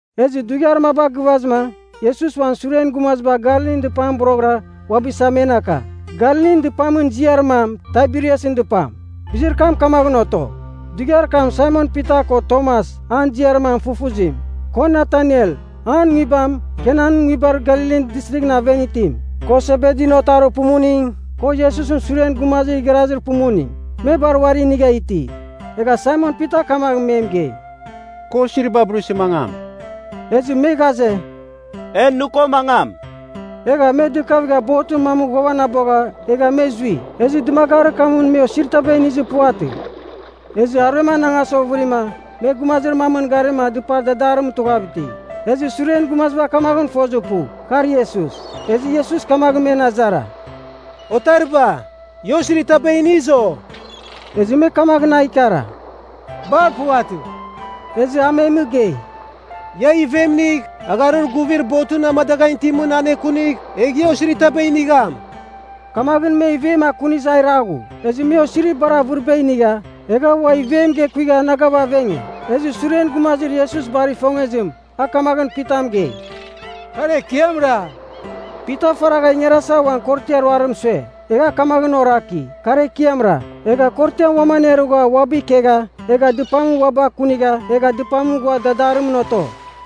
Ezɨ dughiar maba gɨvazɨma Iesus ua uan suren gumaziba Galilin dɨpamɨn boroghɨra uabɨ isa men aka. Galilin dɨpamɨn ziar mam Taiberiasɨn dɨpam. Bizir kam kamaghɨn oto. Dughiar kam Saimon Pita ko Tomas (an ziar mam Fufuzim), ko Nataniel (an nguibam, Kanan nguibar Galilin Distrighɨn aven itim), ko Sebedin otarir pumuning, ko Iesusɨn suren gumazir igharazir pumuning, me bar uari inigha iti. Egha Saimon Pita kamaghɨn me mɨgei, “Kɨ osiriba burisɨ mangam.” Ezɨ me ghaze, “E nɨ ko mangam.” Egha me dɨkavigha botɨn mamɨn ghuavanabogha egha me zui. Ezɨ dɨmagarir kamɨn me osirir taba inizir puvatɨ. Ezɨ aruem anangasa ovɨrima, me gumazir mamɨn garima a dɨpamɨn dadarimɨn tughav iti. Ezɨ suren gumaziba kamaghɨn fozir pu, kar Iesus. Ezɨ Iesus kamaghɨn men azara, “Otariba, ia osiritaba iniz, o?” Ezɨ me kamaghɨn a ikara, “Bar puvatɨ.” Ezɨ a me mɨgei, “Ia ivem inigh, agharir guvir botɨn amadaghan itimɨn anekunigh, egh ia osiritaba inigham.” Kamaghɨn me ivem akunizɨ a iraghu, ezɨ me osirir bar avɨriba inigha, egha ua ivem gekuigha anagav avenge. Ezɨ suren gumazir Iesus bar ifongezim, a kamaghɨn Pita mɨgei, “Kar Ekiamra.” Pita faragha ingarasava uan korotiar aruzim sue. Egha a kamaghɨn oraki, “Kar Ekiamra,” egha korotiam uam anerugha uabɨ ikegha egha dɨpam uabɨ akunigha egha dɨpamɨn ghua dadarimɨn oto.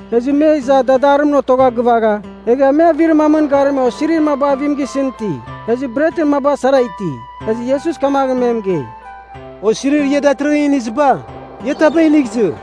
Ezɨ me iza dadarimɨn otogha gɨvagha, egha me avir mamɨn garima osiri maba avim gisɨn iti. Ezɨ bretɨn maba sara iti. Ezɨ Iesus kamaghɨn me mɨgei, “Osirir ia datɨrɨghɨn iniziba, ia taba inigh izɨ.”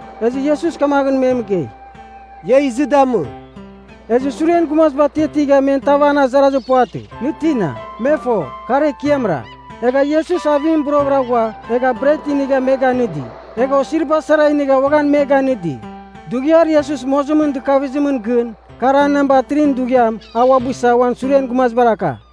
Ezɨ Iesus kamaghɨn me mɨgei, “Ia izɨ damɨ.” Ezɨ suren gumaziba atiatigha men tav an azarazir puvatɨ, “Nɨ tina?” Me fo, kar Ekiamra. Egha Iesus avim boroghɨra ghua egha bret inigha me ganɨdi. Egha osiriba sara inigha uaghan me ganɨdi. Dughiar Iesus mozimɨn dɨkavizimɨn gɨn, kar an namba 3ɨn dughiam a uabɨ isa uan suren gumazibar aka.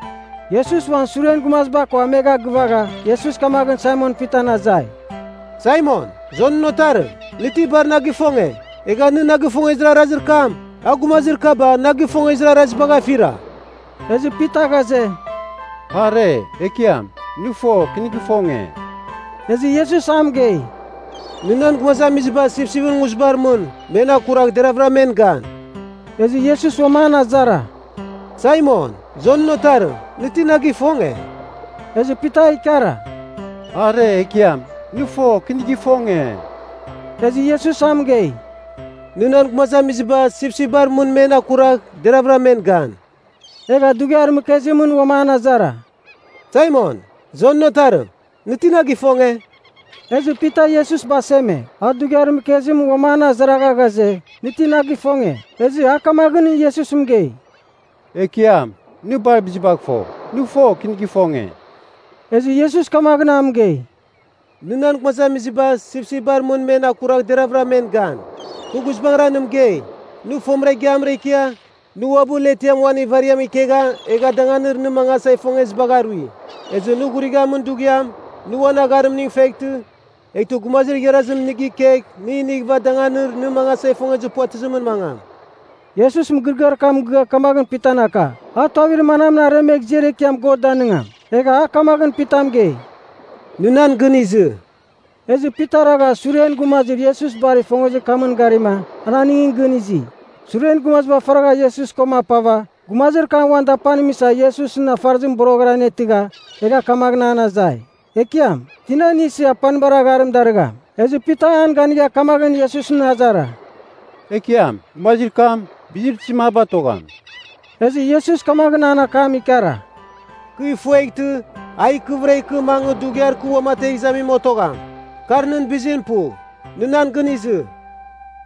Iesus uan suren gumaziba ko amegha gɨvazɨma, Iesus kamaghɨn Saimon Pitan azai, “Saimon, Jonɨn otarim, nɨ ti bar na gifonge, egha nɨ na gifongezir arazir kam, a gumazir kaba na gifongezir arazibagh afira?” Ezɨ Pita ghaze, “Are, Ekiam, nɨ fo, kɨ nɨ gifonge.” Ezɨ Iesus a mɨgei, “Nɨ nan gumazamiziba sipsipɨn nguzibar mɨn men akuragh deraghvɨra men gan.” Ezɨ Iesus uam an azara, “Saimon, Jonɨn otarim, nɨ ti na gifonge?” Ezɨ Pita a ikara, “Are, Ekiam, nɨ fo, kɨ nɨ gifonge.” Ezɨ Iesus a mɨgei, “Nɨ nan gumazamiziba sipsipbar mɨn men akuragh deraghvɨra men gan.” Egha dughiar mɨkezimɨn uam an azara, “Saimon, Jonɨn otarim, nɨ ti na gifonge?” Ezɨ Pita Iesus baseme, a dughiar mɨkezim uam an azara ghaze, nɨ ti na gifonge? Ezɨ a kamaghɨn Iesus mɨgei, “Ekiam, nɨ bar bizibagh fo. Nɨ fo, kɨ nɨ gifonge.” Ezɨ Iesus kamaghɨn a mɨgei, “Nɨ nan gumazamiziba sipsipbar mɨn men akuragh deraghvɨra men gan. Kɨ guizbangɨra nɨ mɨgei, nɨ fomɨra igiamra ikia, nɨ uabɨ letiam uan ivariam ikegha egha danganir nɨ mangasa ifongezibagh arui. Ezɨ nɨ ghurighamin dughiam, nɨ uan agharimning feghtɨ, eghtɨ gumazir igharazim nɨ gikegh nɨ inighɨva danganir nɨ mangasa ifongezir puvatɨzimɨn mangam.” (Iesus mɨgɨrɨgɨar kam mɨgɨa kamaghɨn Pitan aka, a tuavir manamɨn aremegh ziar ekiam God danɨngam.) Egha a kamaghɨn Pita mɨgei, “Nɨ nan gɨn izɨ.” Ezɨ Pita ragha suren gumazir Iesus bar ifongezir kamɨn garima, an aningɨn gɨn izi. Suren gumaziba faragha Iesus koma apava, gumazir kam uan dapanim isa Iesusɨn afarɨzim boroghɨra anetɨgha, egha kamaghɨn an azai, Ekiam, tina nɨ isɨ apanibar agharim darɨgham? Ezɨ Pita an ganigha kamaghɨn Iesus azara, “Ekiam, gumazir kam, bizir tizim a batogham?” Ezɨ Iesus kamaghɨn an akam ikara, “Kɨ ifueghtɨ a ikɨvɨra ikɨ mangɨ dughiar kɨ uamategh izamim otogham, kar nɨn bizim pu. Nɨ nan gɨn izɨ.”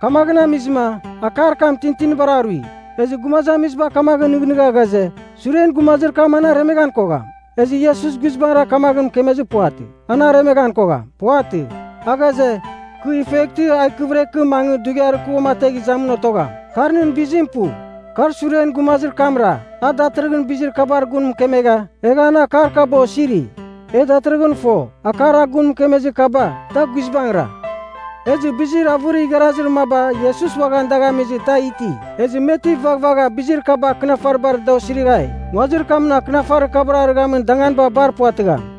Kamaghɨn amizɨma, akar kam tintinibar arui, ezɨ gumazamiziba kamaghɨn nɨghnɨgha ghaze, “Suren gumazir kam an aremeghan kogham.” Ezɨ Iesus guizbangɨra kamaghɨn mɨkemezir puvatɨ, an aremeghan kogham. Puvatɨ. A ghaze, “Kɨ ifueghtɨ a ikɨvɨra ikɨ mangɨ dughiar kɨ uamategh izamim otogham, kar nɨn bizim pu.” Kar suren gumazir kamra, a datɨrɨghɨn bizir kabar gun mɨkemegha, egha an akar kaba osiri. E datɨrɨghɨn fo, akar a gun mɨkemezir kaba, da guizbangɨra. Ezɨ bizir avɨrir igharazir maba Iesus uaghan dagh amizɨ, da iti. Ezɨ me ti vaghvagha bizir kaba akɨnafaribar da osirighai, nguazir kamɨn akɨnafarir kabar arɨghamin danganiba bar puvatɨgham.